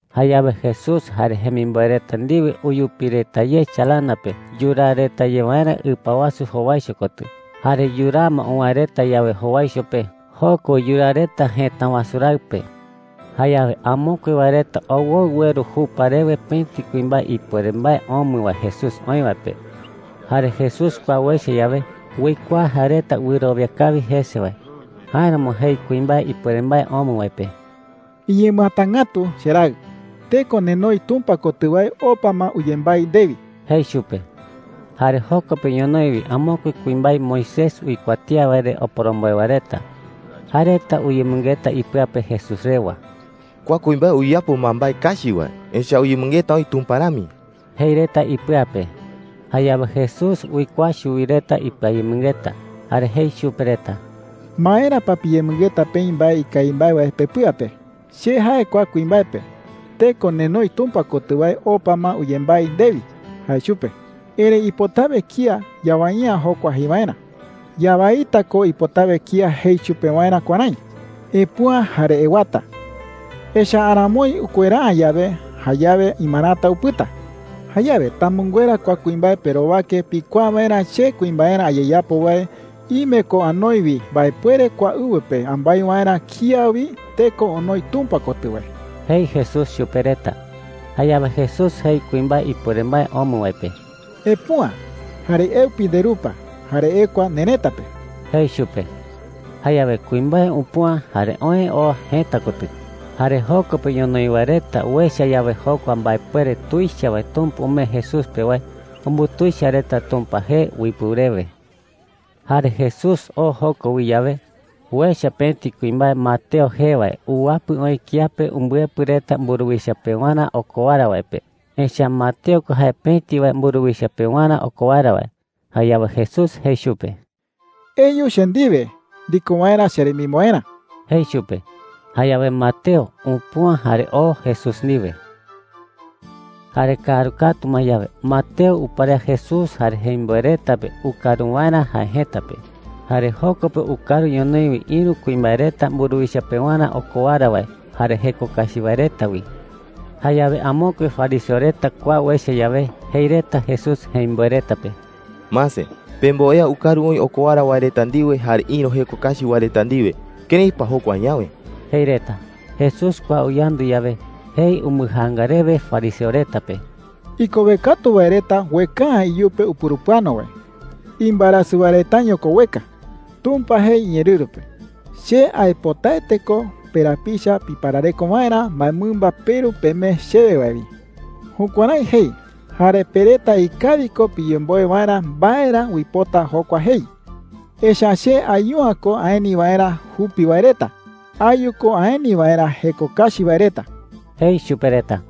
Jayawe Jesús jare jemimboe reta ndiwe uyupi reta ye chalana pe yuraa reta ye waerä ɨpa wasu jowaicho kotɨ. Jare yuraa ma uwäe reta yawe jowaicho pe, joko wi yuraa reta jëta wasu raɨ pe. Jayawe amokue wae reta owoɨ ueru jupa rewe pëti kuimbae ipuere mbae omɨ wae Jesús oï wae pe. Jare Jesús kua uecha yawe, uikuaa jae reta wɨrowia kawi jese wae. Jáeramo jei kuimbae ipuere mbae omɨ wae pe: “Iñemɨatangätu, cheraɨ. Teko nenoi Tumpa kotɨ wae opa ma uyembái ndewi,” jei chupe. Jare joko pe ñonoï wi amokue kuimbae Moisés uikuatía wae re oporomboe wae reta. Jae reta uyemɨngeta ipɨa pe Jesús rewa: “Kua kuimbae uyapo ma mbae kachi wae. Echa’ä uyemɨngeta oï Tumpa rami,” jei reta ipɨa pe. Jayawe Jesús uikuaa chuwi reta ipɨayemɨngeta, jare jei chupe reta: “¿Maera pa piyemɨngeta peï mbae ikawi mbae wae pepɨa pe?” jei. “Che jae kua kuimbae pe, ‘Teko nenoi Tumpa kotɨ wae opa ma uyembái ndewi,’ jae chupe. Erëi ipotawe kía yawai’ä jokua jei waerä,” jei. “Yawaita ko ipotawe kía jei chupe waerä kuärái: ‘Epüa jare ewata.’ Echa’ä aramoi ukuera’ä yawe, jayawe imarata upɨta,” jei. “Jayawe tamɨnguera kua kuimbae perowake pikuaa waerä che kuimbaerä ayeyapo wae ime ko anoi wi mbaepuere kua ɨwɨ pe ambái waerä kía wi teko onoi Tumpa kotɨ wae,” jei Jesús chupe reta. Jayawe Jesús jei kuimbae ipuere mbae omɨ wae pe: “Epüa, jare eupi nderupa, jare ekua nerëta pe,” jei chupe. Jayawe kuimbae upüa jare oë oo jëta kotɨ. Jare joko pe ñonoï wae reta uecha yawe jokua mbaepuere tuicha wae Tumpa umee Jesús pe wae, umbutuicha reta Tumpa jee uipɨu rewe. Jare Jesús oo joko wi yawe, uecha pëti kuimbae Mateo jee wae uwapɨ oï kiape umbɨepɨ reta mburuwicha pewarä okowara wae pe. Echa’ä Mateo ko jae pëti wae mburuwicha pewarä okowara wae. Jayawe Jesús jei chupe: “Eyu che ndiwe ndiko waerä cheremimboerä,” jei chupe. Jayawe Mateo upüa jare oo Jesús ndiwe. Jare kaaru katu ma yawe, Mateo uparea Jesús jare jemimboe reta pe ukaru waerä jae jëta pe. Jare joko pe ukaru ñonoï wi ïru kuimbae reta mburuwicha pewarä okowara wae jare jeko kachi wae reta wi. Jayawe amokue fariseo reta kua uecha yawe, jei reta Jesús jemimboe reta pe: “Mase, pemboea ukaru oï okowara wae reta ndiwe jare ïru jeko kachi wae reta ndiwe. ¿Kërái pa jokua añawe?” jei reta. Jesús kua uyandu yawe, jei umbɨjaanga rewe fariseo reta pe: “Ikowe katu wae reta ueka’ä iyupe upurupɨano wae. Imbaerasɨ wae retaño ko ueka,” jei. “Tumpa jei iñeerɨru pe: ‘Che aipotaete ko perapicha piparareko waerä mbaemɨmba peru pemee chewe wae wi.’ Jukuärái jei. Jare pe reta ikawi ko piyemboe waerä mbae ra uipota jokua jei. Echa’ä che ayu’ä ko aeni waerä jupi wae reta. Ayu ko aeni waerä jeko kachi wae reta,” jei chupe reta.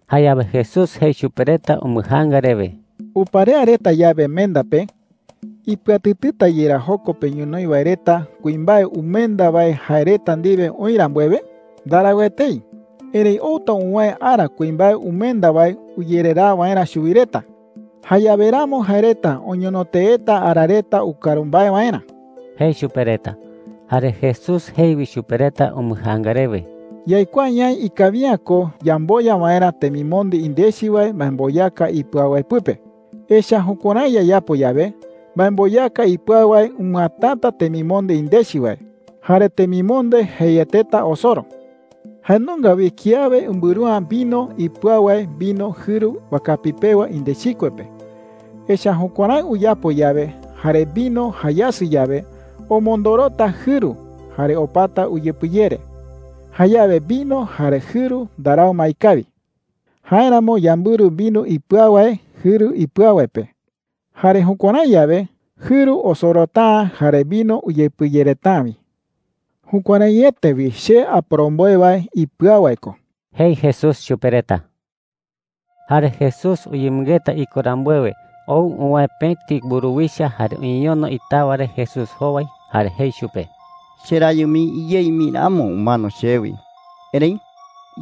Jayawe Jesús jei chupe reta umbɨjaanga rewe: “Uparea reta yawe menda pe, ¿ipɨatɨtɨta yerá joko pe ñonoï wae reta kuimbae umenda wae jae reta ndiwe oï rambuewe? Ndarau etei,” jei chupe reta. “Erëi outa uwäe ara kuimbae umenda wae uyereraa waerä chuwi reta. Jayawe ramo jae reta oñono teeta ara reta ukaru mbae waerä,” jei chupe reta. Jare Jesús jei wi chupe reta umbɨjaanga rewe: “Yaikuaa ñaï ikawi’ä ko yamboya waerä temimonde indechi wae mbaemboyaka ipɨau wae pɨpe. Echa’ä jukuärái yayapo yawe, mbaemboyaka ipɨau wae umɨatata temimonde indechi wae, jare temimonde jeieteta osoro,” jei chupe reta. “Jae nunga wi kiawe umbɨru’ä vino ipɨau wae vino jɨru wakapi pewa indechikue pe. Echa’ä jukuärái uyapo yawe jare vino jayasɨ yawe, omondorota jɨru jare opata uyepɨyere. Jayawe vino jare jɨru ndarau ma ikawi,” jei chupe reta. “Jáeramo yambɨru vino ipɨau wae jɨru ipɨau wae pe. Jare jukuärái yawe, jɨru osorota’ä jare vino uyepɨyereta’ä wi,” jei. “Jukuäraiete wi che aporomboe wae ipɨau wae ko,” jei Jesús chupe reta. Jare Jesús uyemɨngeta iko rambuewe, ou uwäe pëti mburuwicha jare uñeñono itawa re Jesús jowai, jare jei chupe: “Cherayɨ mii iyei mii ramo umano chewi. Erëi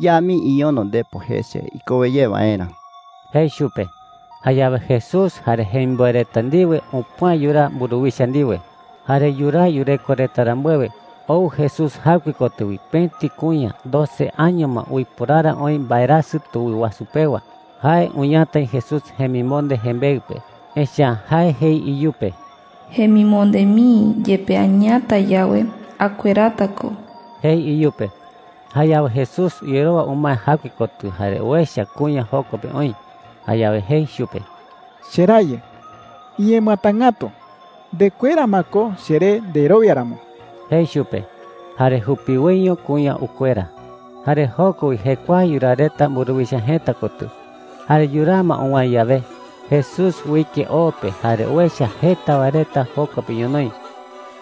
ya mii iñono ndepo jese ikowe ye waerä,” jei chupe. Jayawe Jesús jare jemimboe reta ndiwe upüa yuraa mburuwicha ndiwe. Jare yuraa yureko reta rambuewe, ou Jesús jaɨkue kotɨ wi pëti kuña doce año ma uiporara oï mbaerasɨ tuwɨ wasu pewa. Jae uñatai Jesús jemimonde jembeɨ pe. Echa’ä jae jei iyupe: “Jemimonde mii yepe añatai yawe, akuerata ko,” jei iyupe. Jayawe Jesús uyerowa umae jaɨkue kotɨ jare uecha kuña joko pe oï. Jayawe jei chupe: “Cherayɨ, iñemɨatangätu. Ndekuera ma ko cheré nderowia ramo,” jei chupe. Jare jupiwoiño kuña ukuera. Jare joko wi jekuae yuraa reta mburuwicha jëta kotɨ. Jare yuraa ma uwäe yawe, Jesús uike o pe jare uecha jeta wae reta joko pe ñonoï.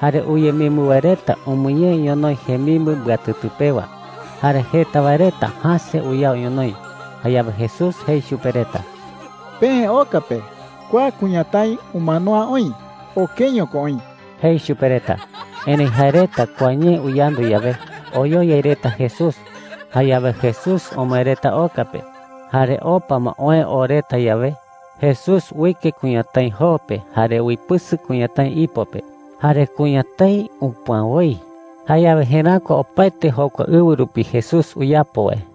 Jare uyemimbɨ wae reta umɨñee ñonoï jemimbɨ mbɨatɨtɨ pewa. Jare jeta wae reta jäse uyao ñonoï. Jayawe Jesús jei chupe reta: “Peë oka pe. Kua kuñatái umano’ä oï. Okeño ko oï,” jei chupe reta. Erëi jae reta kua ñee uyandu yawe, oyoyai reta Jesús. Jayawe Jesús omoë reta oka pe. Jare opa ma oë oo reta yawe, Jesús uike kuñatái joo pe jare uipɨsɨ kuñatái ipo pe. ¡Jare kuñatái upüa woi! Jayawe jeräkua opaete jokua ɨwɨ rupi Jesús uyapo wae.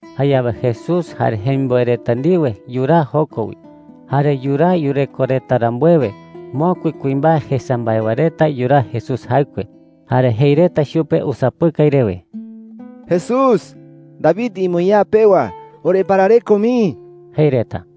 Jayawe Jesús jare jemimboe reta ndiwe yuraa joko wi. Jare yuraa yureko reta rambuewe, mokui kuimbae jesa mbae wae reta yuraa Jesús jaɨkue. Jare jei reta chupe usapɨkai rewe: “Jesús, David iñemoñaa pewa, oreparareko mii,” jei reta.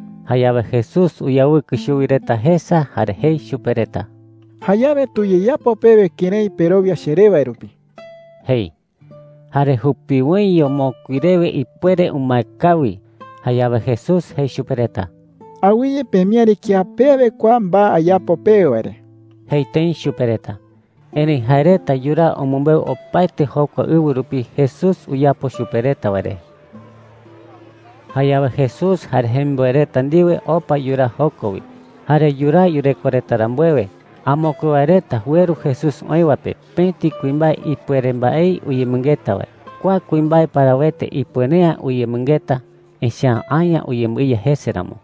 Jayawe Jesús uyawɨkɨ chuwi reta jesa, jare jei chupe reta: “Jayawe tuyeyapo pewe kërái perowia cheré wae rupi,” jei. ¡Jare jupiwoiño mokui rewe ipuere umae kawi! Jayawe Jesús jei chupe reta: “Awɨye pemiäri kía pe awe kua mbae ayapo pewe wae re,” jei tëi chupe reta. Erëi jae reta yuraa umɨmbeu opaete jokua ɨwɨ rupi Jesús uyapo chupe reta wae re. Jayawe Jesús jare jemimboe reta ndiwe opa yuraa joko wi. Jare yuraa yureko reta rambuewe, amokue wae reta ueru Jesús oï wae pe pëti kuimbae ipuere mbaei uyemɨngeta wae. Kua kuimbae parawete ipuere’ä uyemɨngeta, echa’ä aña uyembɨiya jese ramo.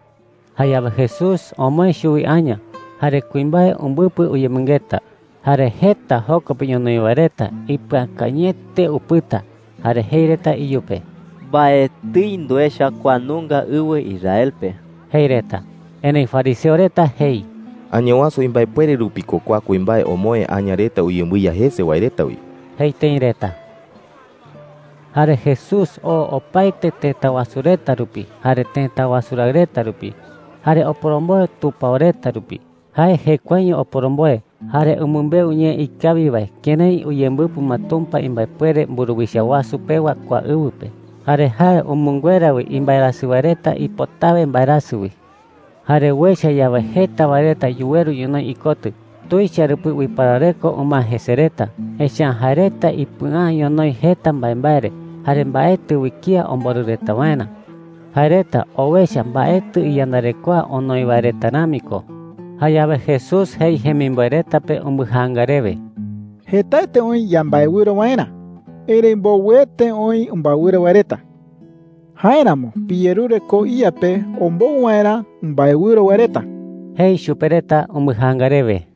Jayawe Jesús omoë chuwi aña jare kuimbae umbɨpɨ uyemɨngeta. Jare jeta joko pe ñonoï wae reta ipɨakañɨete upɨta, jare jei reta iyupe: “Mbaetɨi nduecha kua nunga ɨwɨ Israel pe,” jei reta. Erëi fariseo reta jei: “Añawasu imbaepuere rupi ko kua kuimbae omoë aña reta uyembɨiya jese wae reta wi,” jei tëi reta. Jare Jesús oo opaete tëta wasu reta rupi jare tëta wasu raɨ reta rupi, jare oporomboe tupao reta rupi. Jae jekuaeño oporomboe, jare umɨmbeu ñee ikawi wae kërái uyembɨpɨ ma Tumpa imbaepuere mburuwicha wasu pewa kua ɨwɨ pe. Jare jae umɨnguera wi imbaerasɨ wae reta ipotawe mbaerasɨ wi. Jare uecha yawe jeta wae reta yuweru ñonoï ikotɨ, tuicha rupi uiparareko umae jese reta. Echa’ä jae reta ipɨa’ä ñonoï jeta mbaembae re jare mbaetɨ wi kía omborɨ reta waerä. Jae reta owecha mbaetɨ iyandarekoa onoi wae reta rami ko. Jayawe Jesús jei jemimboe reta pe umbɨjaanga rewe: “Jetaete oï yambaewɨro waerä, erëi mbowɨete oï umbaewɨro wae reta. Jáeramo piyerure koo iYa pe ombou waerä umbaewɨro wae reta,” jei chupe reta umbɨjaanga rewe.